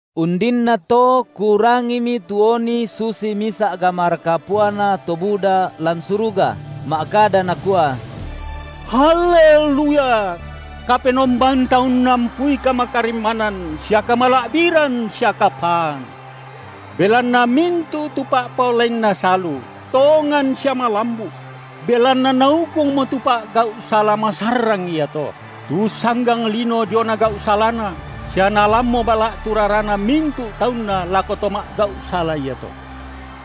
Undinnato kurangimi tu oni susi misa’ gamara kapuana to buda lan suruga ma’kada nakua: Haleluya! Kapenombanta unnampui kamakarimmanan sia kamala’biran sia kapaan, belanna mintu’ tu pa’paolainNa salu tongan sia malambu’; belanna Naukungmo tu pa’gau’ sala masarrang iato, tu ussanggang lino diona gau’ salana, sia Naalammo bala’ tu rarana mintu’ taunNa lako to ma’gau’ sala iato.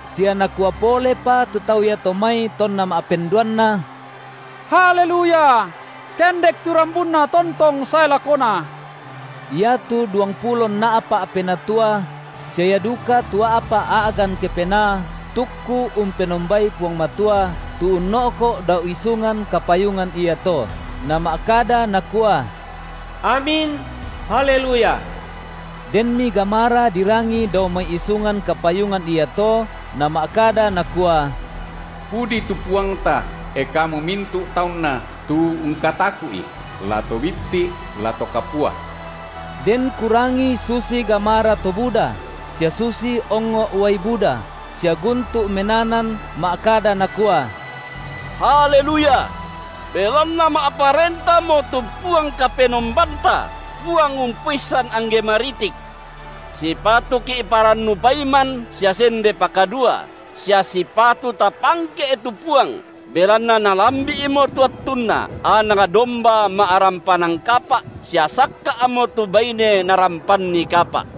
Sia nakua polepa tu tau iato mai tonna ma’penduanna: Haleluya! Kendek tu rambunna tontong sae lakona. Iatu duangpulo nna’pa’ penatua sia ia duka tu a’pa’ a’gan kepenaa tukku umpenombai Puang Matua tu unno’ko’ dao isungan kapayungan iato, nama’kada nakua: Amin! Haleluya! Denmi gamara dirangi dao mai isungan kapayungan iato nama’kada nakua: Pudi tu Puangta, e kamu mintu’ taunNa tu ungkataku’I, la to bitti’ la to kapua! Den kurangi susi gamara to buda sia susi ongngo’ uai buda, sia guntu’ menanan ma’kada nakua: Haleluya! Belanna ma’parentamo tu Puang Kapenombanta, Puang Umpoissan angge maritik. Sipatuki’ parannu paiman sia sende pakadua, sia sipatu tapangke’ tu Puang, belanna nalambi’mo tu attunNa Anak domba ma’rampanan kapa’ sia sakka’mo tu baine Narampanni kapa’.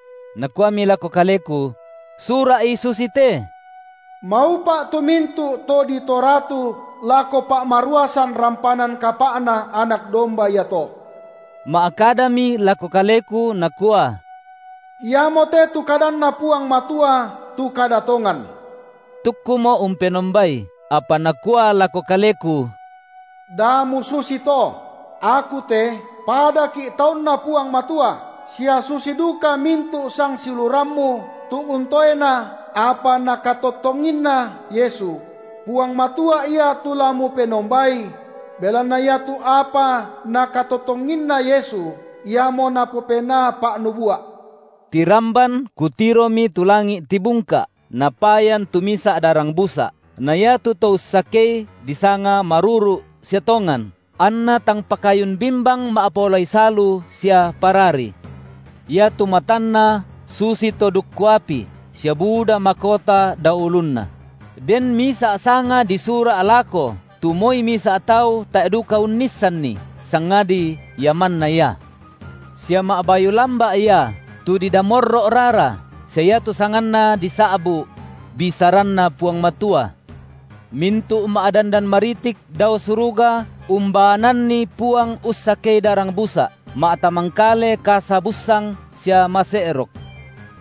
Nakuami lako kaleku: Sura’i susite: Maupa’ tu mintu’ to ditoratu lako pa’maruasan rampanan kapa’Na Anak domba iato. Ma’kadami lako kaleku, nakua: Iamote tu kadanNa Puang Matua, tu kada tongan. Tukkumo’ umpenombai, apa nakua lako kaleku: Da mususi to! Aku te, padaki’ taunNa Puang Matua, sia susi duka mintu’ sangsiulurammu tu untoena apa Nakatottonginna Yesu; Puang Matua Ia tu la mupenombai! Belanna iatu apa Nakatottonginna Yesu, iamo napopenaa pa’nubua’. Tiramban kutiromi tu langi’ tibungka’, napayan tu misa’ darang busa’, na iatu to ussakei disanga Maruru’ sia Tongan, anNa tang pakayun bimbang ma’paolai salu sia parari. Iatu matanNa susito dukku api sia buda makota dao ulunNa; den misa’ sanga disura’ lako tu moi misa’ tau tae’ duka unnissanni, sangadi Ia manna Ia. Sia ma’bayu lamba’ Ia, tu didamorro’ rara, sia iatu sanganNa disa’bu’: BisaranNa Puang Matua. Mintu’ ma’dandan maritik dao suruga umbaananni Puang ussakei darang busa’, ma’tamangkale kasa bussang sia mase’rok.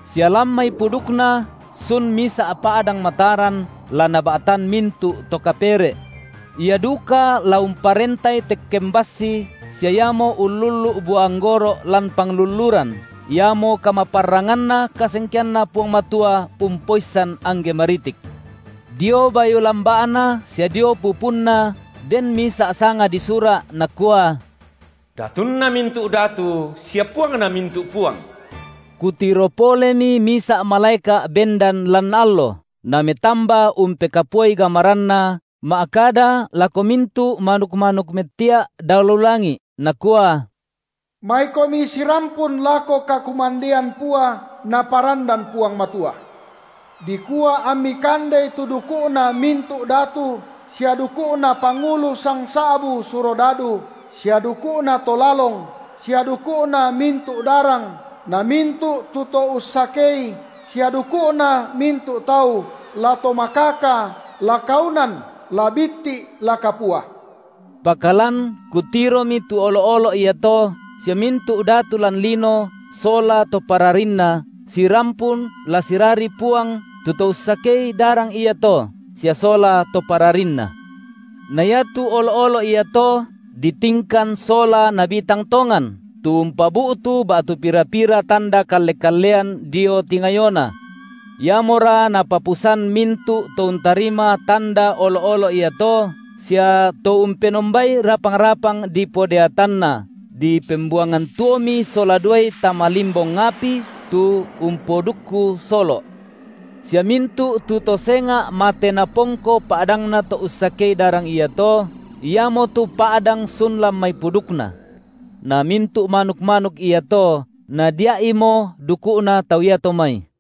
Sia lan mai pudukNa sun misa’ pa’dang mataran la Naba’tan mintu’ to kapere’. Ia duka la umparentai tekken bassi sia iamo ullullu’ bua anggoro’ lan panglulluran, iamo kamaparranganna kasengkeanNa Puang Matua Umpoissan angge maritik. Dio bayu lamba’Na sia dio pupunNa den misa’ sanga disura’ nakua: Datunna mintu’ datu sia Puangna mintu’ puang. Kutiro polemi misa’ malaeka’ bendan lan allo, nametamba umpekapuai gamaranna ma’kada lako mintu’ manuk-manuk mettia’ dao lu langi’, nakua: Maikomi sirampun lako kakumandean pua Naparandan Puang Matua, dikua ammi kandei tu duku’na mintu’ datu, sia duku’na pangulu sangsa’bu surodadu, sia duku’na to lalong, sia duku’na mintu’ darang na mintu’ tu to ussakei, sia duku’na mintu’ tau, la to makaka, la kaunan, la bitti’ la kapua. Pakalan kutiromi tu olo’-olo’ iato sia mintu’ datu lan lino sola to pararinna sirampun la sirari Puang tu To ussakei darang iato sia sola to pararinNa. Na iatu olo’-olo’ iato ditingkan sola nabi tang tongan tu umpabu’tu ba’tu pira-pira tanda kalle-kallean dio tingayona. Iamora napapusan mintu’ to untarima tanda olo’-olo’ iato sia to umpenombai rapang-rapang dipodeatanna, dipembuangan tuomi sola duai tama limbong api tu umpodukku solo’. Sia mintu’ tu to senga’ mate napongko pa’dangna To-ussakei darang iato, iamotu pa’dang sun lan mai pudukNa. Na mintu’ manuk-manuk iato nadia’imo duku’na tau iato mai.